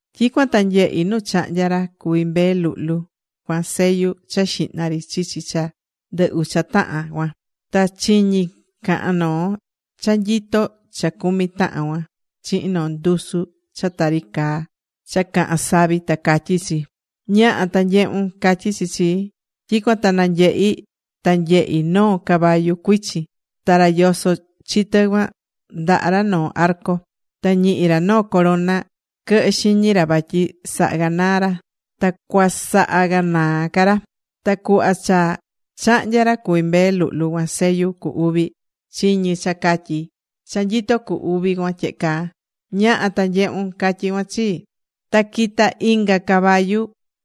Tyicuan ta nyehi̱ nu chahnya̱ ra cuví Mbee Luhlu cuan sellu cha xihna ri chichi cha ndɨ ucha tahan cuan. Ta chiñi̱ cahán noo cha nyitó cha cumi tahan cuan, chihin noo ndusu cha tari caá cha cahán savi ta catyí chi: ―¡Ña̱ha, ta nye̱hun! ―catyí chi chii. Tyicuan ta nanyehi̱ ta nyehi̱ noo caballu cuichin, ta ra yosó chi tɨ cuan ndaha ra noo arco. Ta ñihi̱ ra noo corona quɨhɨ xiñi ra vatyi saha ganaa̱ ra, ta cuasaha ganaa ca ra. Ta cuhva cha chahnya̱ ra cuví Mbee Luhlu cuan sellu cu uvi, chiñi̱ cha catyí cha nyitó cu uvi cuan tyehe caa: ―¡Ña̱ha ta nye̱hun! ―catyí cuan chii. Ta quita̱ inga caballu,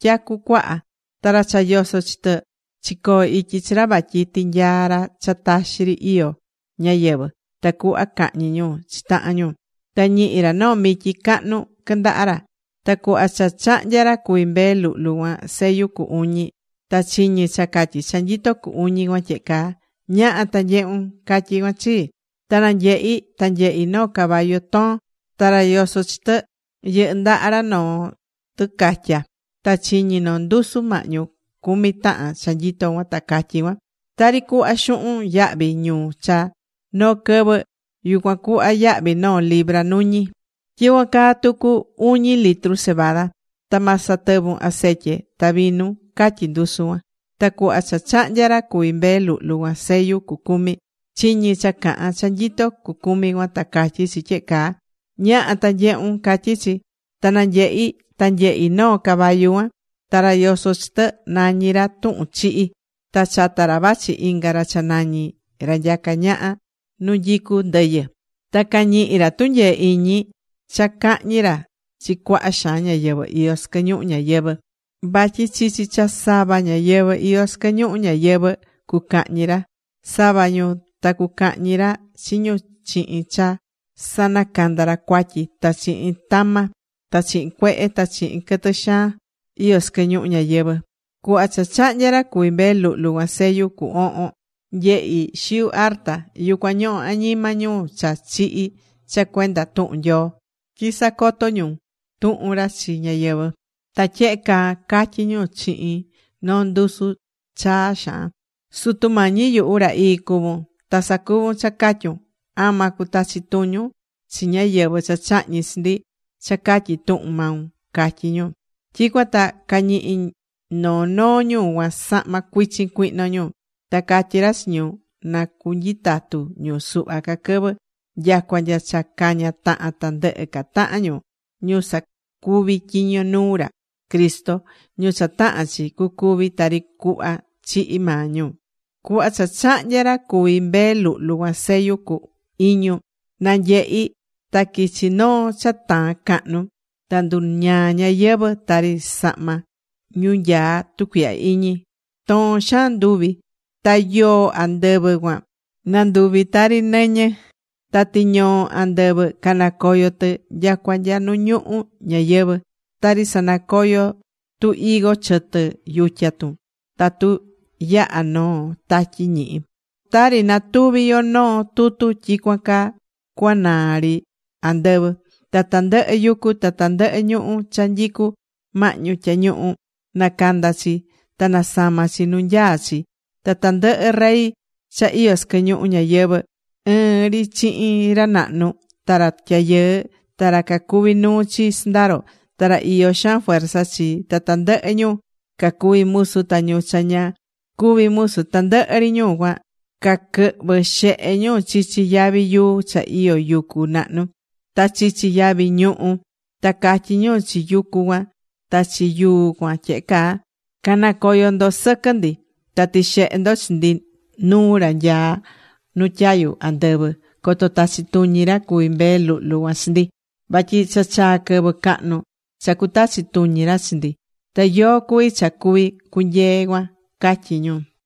tyacu cuaha. Ta ra cha yosó chi tɨ chicoo̱ ityi chi ra vatyi tinyaa ra cha taxi ri iyó ñayɨvɨ̱, tacuhva cahñi ñu chi tahan ñu. Ta ñihi̱ ra noo mityi cahnu quɨndaha ra. Ta cuhva cha chahnya̱ ra cuví Mbee Luhlu cuan sellu cu uñi, ta chiñi̱ cha catyí cha nyitó cu uñi cuan tyehe caá: ―¡Ña̱ha ta nye̱hun! ―catyí cuan chii. Ta nanyehi̱, ta nyehi̱ noo caballu toon. Ta ra yosó chi tɨ, yɨhɨ́ ndaha ra noo tɨcatya. Ta chiñi̱ noo ndusu mahñu cumi tahan cha nyitó cuan, ta catyí cuan: ―Tari cuhva xuhun yahvi ñu cha noo quɨvɨ, yucuan cuhva yahvi noo litru nuñi. Tyicuan caa tucu uñi litru cebada. Ta ma satɨvun acetye ta vinu ―catyí ndusu cuan. Ta cuhva cha chahnya̱ ra cuví Mbee Luhlu cuan sellu cu cumi, chiñi̱ cha cahán cha nyitó cucumi cuan, ta catyí chi, tyehe caa: ―¡Ña̱ha ta nye̱hun! ―catyí chi. Ta nanyehi̱ ta nyehi̱ noo caballu cuaan. Ta ra yosó chi tɨ nañí ra Tuhun Chihi. Ta chata ra vachi inga ra cha nañí Ra Nyacá Ñaha Nu Nyicú Ndɨyɨ. Ta cañihi̱ ra tunyee iñi cha cahñi ra chi cuaha xaan ñáyɨvɨ iyó sɨquɨ ñuhu ñayɨvɨ̱. Vatyi chichi cha sava ñáyɨvɨ iyó sɨquɨ ñuhu ñayɨvɨ̱, cucahñi ra sava ñu. Ta cucahñi ra chi ñu chihin cha sanacanda ra cuatyi, ta chihin tama, ta chihin cuehe, ta chihin quɨtɨ xaan iyó sɨquɨ ñuhu ñayɨvɨ̱. Cuhva cha chahnya̱ ra cuví Mbee Luhlu cuan sellu cu ohon, nyehi̱ xiu arta. Yucuan ñohó añima ñu cha chihi̱ cha cuenda tuhun Nyoo tyi sacoto̱ ñu tuhun ra chi ñáyɨvɨ. Ta tyehe caa catyí ñu chihin noo ndusu chaa xaan: ―Sutu Mañi yuhu, ra ii cuvún. Ta sacuvún cha catyún. ¿Ama cutachi tuñun chi ñáyɨvɨ cha chahñi̱ chi ndi cha catyi tuhun maun? ―catyí ñu. Tyicuan ta cañihi̱ noo noo ñu cuan sahma cuichin cuihno ñu. Ta catyí ra chi ñu na canyitatu ñu suhva ca quɨvɨ, nyacua nya cha caña tahan tandɨhɨ ca tahan ñu, ñu sacuví tyiño nuu ra Cristo, ñu cha tahán chi cucúvi tari cuhva chihi̱ maa ñu. Cuhva cha chahnya̱ ra cuví Mbee Luhlu cuan sellu cu iñu, nanyehi̱ ta quichi noo cha taán cahnu. Ta nduñaa̱ ñayɨvɨ̱, tari sahma ñu nyaá tucuihya iñi, toon xaan nduvi̱. Ta yoo andɨvɨ cuan nanduvi̱ tari nɨñɨ. Ta tiñoo andɨvɨ canacoyo̱ tɨ nya nu ñuhu ñayɨvɨ̱. Tari sanacoyo tu higo chɨtɨ yutya tun tatu yahá noo tatyi ñihi. Tari natuví yo noo tutu tyicuan caa cuanaa ri andɨvɨ. Ta tandɨhɨ yucu ta tandɨhɨ ñuhú cha nyicú mahñu tyañuhu nacanda̱ chi ta nasama̱ chi nu nyaá chi. Ta tandɨhɨ rey cha iyó sɨquɨ ñuhu ñayɨvɨ̱ ɨɨn ri chihin ra nahnu, ta ra tyayɨɨ, ta ra cacuví nuu chi sɨndaro, ta ra iyó xaan fuerza chi, ta tandɨhɨ ñu cacuví musu, ta ñu cha ña cuví musu, tandɨhɨ ri ñu cuan caquɨhvɨ̱ xehe ñu chichi yavi yuu cha iyó yucu nahnu, ta chichi yavi ñuhú. Ta catyí ñu chi yucu cuan ta chi yuu cuan tyehe caa: ―Ca̱nacoyo ndo sɨquɨ ndi, ta ti̱xehe ndo chi ndi nuu ra nyaá nu tyayu andɨvɨ, coto tachi tuñi ra cuví Mbee Luhlu cuan chi ndi. Vatyi cha chaa̱ quɨvɨ cahnu cha cutachi tuñi ra chi ndi. ¿Ta yóó cuví cha cuví cunyee cuan? ―catyí ñu.